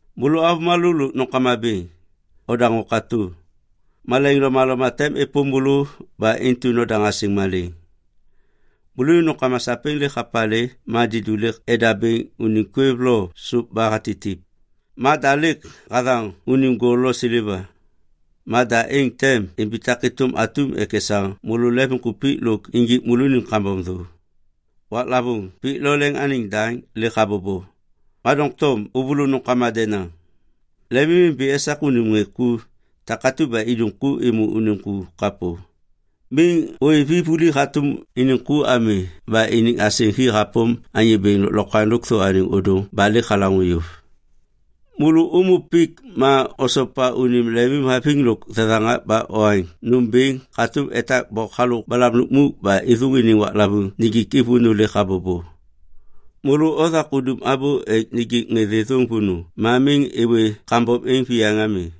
Môlô avômalô lôk nômkama bêŋ, odaŋô katô! Malaiŋ lomaloma tem êpôm môlô ba intu nodaŋ asêŋ malêŋ. Môlônim nômkama sapêŋ lêk hapalê ma didu lêk edabêŋ unim kwêv lo sôp ba hatitip ma da lêk hathaŋ unim gol lo seleva. Ma da êŋ tem imbitak êtôm atum ek esaŋ môlô lemvimkupik lôk injik môlônim kambom thô. Waklavôŋ pik lo leŋ anêŋ daŋ lêk habobo, ma doŋtom ôvôlô nômkama denaŋ. Lemimimbi esak unim ŋê ku takatu ba idum ku êmô unim ku kapô. Miŋ ôêv i vuli hatôm iniŋ ku ami ba iniŋ asêŋ hi hapôm Anyô Bêŋ Lôklokwaŋ Lôkthô Anêŋ Ôdôŋ ba lêk halaŋô yôv. Môlô ômô pik ma osopa unim lemimhaviŋ lôk thethaŋak ba oaŋ nôm bêŋ hatôm etak bok halôk balam lukmuk ba êthôŋ iniŋ waklavôŋ nijik i vônô lêk habobo. Môlô othak udum abô ek nijik ŋê thêthôŋ vônô ma miŋ êwê kambom êŋ viyaŋ ami.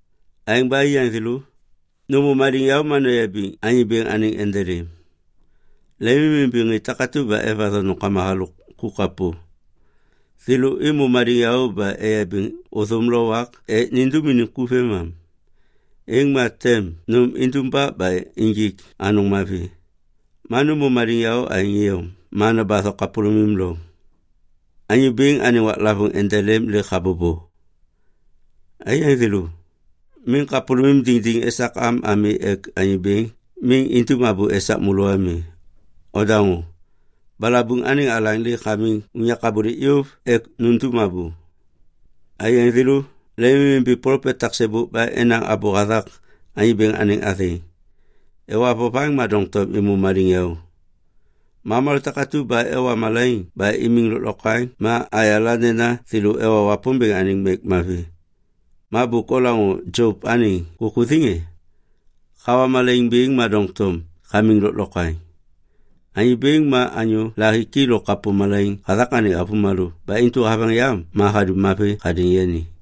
Aêŋ ba aiyaŋ thêlô, nômô maliŋyaô ma noyabiŋ Anyô Bêŋ anêŋ endelêm. Lemimimbi ŋê takatu ba evatho nômkama halôk ku kapô. Thêlô êmô maliŋyaô ba eyabiŋ ôthôm lo wak ek nindum iniŋ ku vêmam. Êŋ ma tem nôm indumbak ba injik anôŋ mavi. Ma nômô maliŋyaô aêŋ iyom ma nobatho kapôlômim loŋ. Anyô Bêŋ anêŋ waklavôŋ endelêm lêk habobo. Aiyaŋ thêlô, miŋ kapôlôŋ diŋdiŋ esak am ami ek Anyô Bêŋ miŋ indum abô esak môlô ami. Odaŋô, balabuŋ anêŋ alaŋ lêk hamiŋ unyak abôlêk yôv ek nundum abô! Aiyaŋ thêlô, lemimimbi plopet taksêbôk ba enaŋ abô hathak Anyô Bêŋ anêŋ athêŋ. Ewa vovaŋ ma doŋtom êmô maliŋyaô. Ma avômalô takatu ba ewa malaiŋ ba imiŋ lôklokwaŋ ma ayala nena thêlô ewa Wapômbêŋ anêŋ mek mavi. Ma bôk olaŋô Jop anêŋ kukuthiŋ e? Hawa malaiŋ bêŋ ma doŋtom hamiŋ lôklokwaŋ. Anyô Bêŋ ma anyô lahiki lôk kapô malaiŋ hathak anêŋ avômalô ba intu haveŋ yam ma hadum mavi hadêŋ yani.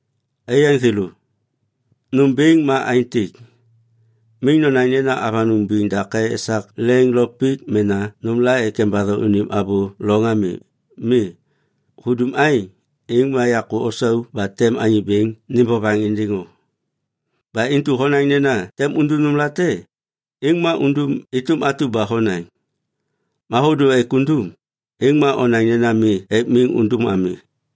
Aiyaŋ thêlô, nômbêŋ ma aêntêk. Miŋ nonaŋ nena avanôŋ biŋ dake esak leŋ lo pik mena nômla ek embatho unim abô loŋ ami. Mi, hudum aêŋ, êŋ ma yakô osau ba tem Anyô Bêŋ nêm vovaŋ êndêŋ o. Ba intu honaŋ nena tem undum nômlate, êŋ ma undum êtôm atu ba honaŋ. Ma hôdô ek undum, êŋ ma onaŋ nena mi ek miŋ undum ami.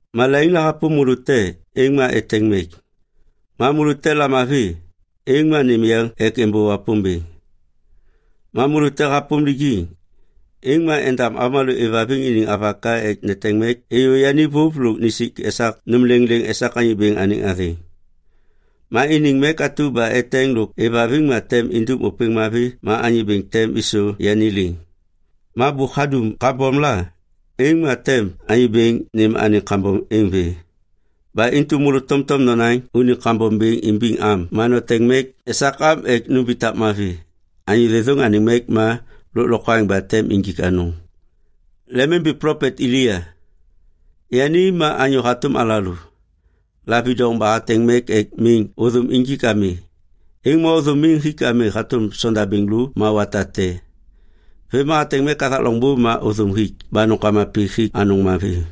Malaiŋ la hapôm môlô te, êŋ ma eteŋ mek. Ma môlô te lamavi, êŋ ma nêm yeŋ ek êmbô Wapômbêŋ. Ma môlô te hapôm lijiŋ, êŋ ma endam avômalô êvhaviŋ iniŋ avaka ek neteŋ mek êyô yani vôv lôk nisik esak nôm lêŋlêŋ esak Anyô Bêŋ anêŋ athêŋ. Ma iniŋ mek atu ba eteŋ lôk êvhaviŋ ma tem indum ôpêŋ mavi ma Anyô Bêŋ tem êsô yani liŋ. Ma bôk hadum kambom la, êŋ ma tem Anyô Bêŋ nêm anêŋ kambom êŋ vê. Ba intu môlô tomtom nonaŋ unim kambom bêŋ imbiŋ am ma noteŋ mek esak am ek numbitak mavi. Anyô thêthôŋ anêŋ mek ma lôklokwaŋ ba tem injik anôŋ. Lemimbi plopet Elia. Yani ma anyô hatôm alalô. Lavidoŋ ba hateŋ mek ek miŋ ôthôm injik ami, êŋ ma ôthôm miŋ hik ami hatôm sondabêŋ lô ma wata te. Vêm ma hateŋ mek hathak loŋbô ma ôthôm hik ba nômkama pik hik anôŋ mavi.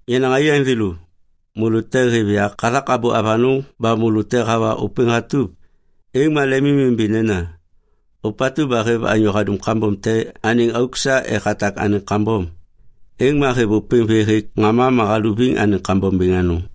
Yenaŋ aiyaŋ thêlô, môlô te hêv yak hathak abô avanôŋ ba môlô te hawa ôpêŋ hatup, êŋ ma lemimimbi nena, “Ôpatu ba hêv anyô hadum kambom te anêŋ auk sa ek hatak anêŋ kambom, êŋ ma hêv ôpêŋ vê hêk ŋama ma haluviŋ anêŋ kambom bêŋ anôŋ.”